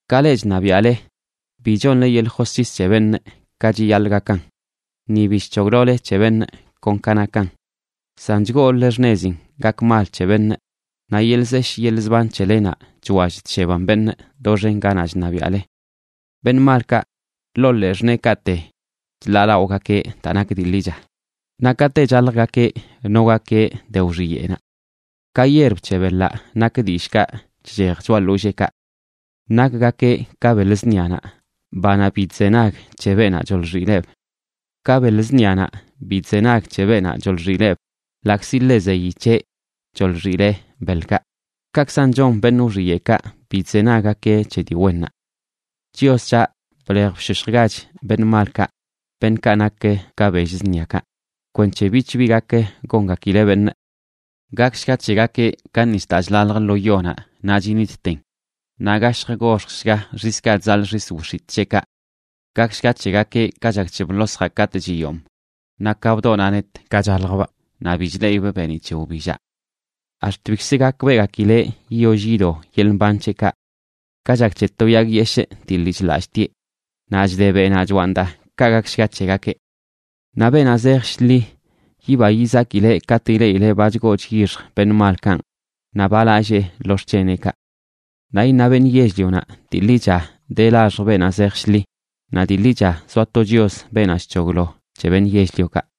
Ka leꞌ chṉabiaꞌle, bi chonle yeḻꞌ josc̱his c̱he beṉꞌ ka chiyaḻꞌ gakan, ni bi chc̱hoglole c̱he beṉꞌ kon ka nakan. San chgooləle xṉezin gak mal c̱he beṉꞌ; naꞌ yeḻꞌ zeshꞌ yeḻꞌ zban c̱helenaꞌ chwall chsheban beṉꞌ doxen ganaꞌ chṉabiaꞌle. Beṉꞌ malkaꞌ ḻoo ḻee xṉeekaꞌte chḻaalaꞌogakeꞌ daa nak dii ḻicha, naꞌ kate chaljgakeꞌ nogakeꞌ de wxiyeꞌnaꞌ. Ka yierb c̱he beḻaꞌ nak dillꞌkaꞌ chchej choꞌa ḻolleekaꞌ. Nakgakeꞌ ka beḻ zṉianaꞌ, banaꞌ bi chzenag c̱he beenaꞌ choḻxileꞌb. Ka beḻ zṉianaꞌ bi chzenag c̱he beenaꞌ choḻxileꞌb ḻaꞌkzi ḻe zeyi c̱heꞌ choḻxileꞌ beḻkaꞌ, kaꞌkzan chon beṉꞌ wxiyeꞌkaꞌ, bi chzenaggakeꞌ c̱he dii wennaꞌ. Chios c̱haꞌ, blej bshoshjgach beṉꞌ malkaꞌ, beṉꞌkaꞌ nak ka bell zṉiakaꞌ, kwenc̱he bich bi gak gongakileꞌ beṉꞌ. Gakshga c̱hegakeꞌ ka nis daa chlalj lo yonaꞌ naꞌ chinitten, naꞌ gashj goxjshga xiskaꞌ chzaḻꞌ xis wix̱itꞌ c̱heꞌkaꞌ. Gakshga c̱hegakeꞌ ka chak bḻosjaꞌ katꞌ chiyomꞌ; naꞌ ka bdoꞌnaꞌ net ka chaljbꞌ, ni bi chleꞌibꞌ beeniꞌ c̱he wbillaꞌ. Ax̱t bikz gakbeꞌgakileꞌ yiyoll yido yeḻꞌ mban c̱heꞌkaꞌ. Ka chak c̱he to yag yeshꞌ dii lii chḻallꞌtieꞌ naꞌ chde beꞌnaꞌ choaꞌn daa, ka gakshga c̱hegakeꞌ. Naꞌ beenaꞌ zej shḻi yiba yizakileꞌ katꞌ ileꞌileꞌ ba chgoo chyixj beṉꞌ malkanꞌ, naꞌ ba lallee lo xc̱heneꞌkaꞌ. Naꞌ iṉa beṉꞌ yell-lionaꞌ: “Dii ḻicha de laxj beenaꞌ zej shḻi, naꞌ dii ḻicha zoa to Chios, beenaꞌ chc̱hoglo c̱he beṉꞌ yell-liokaꞌ.”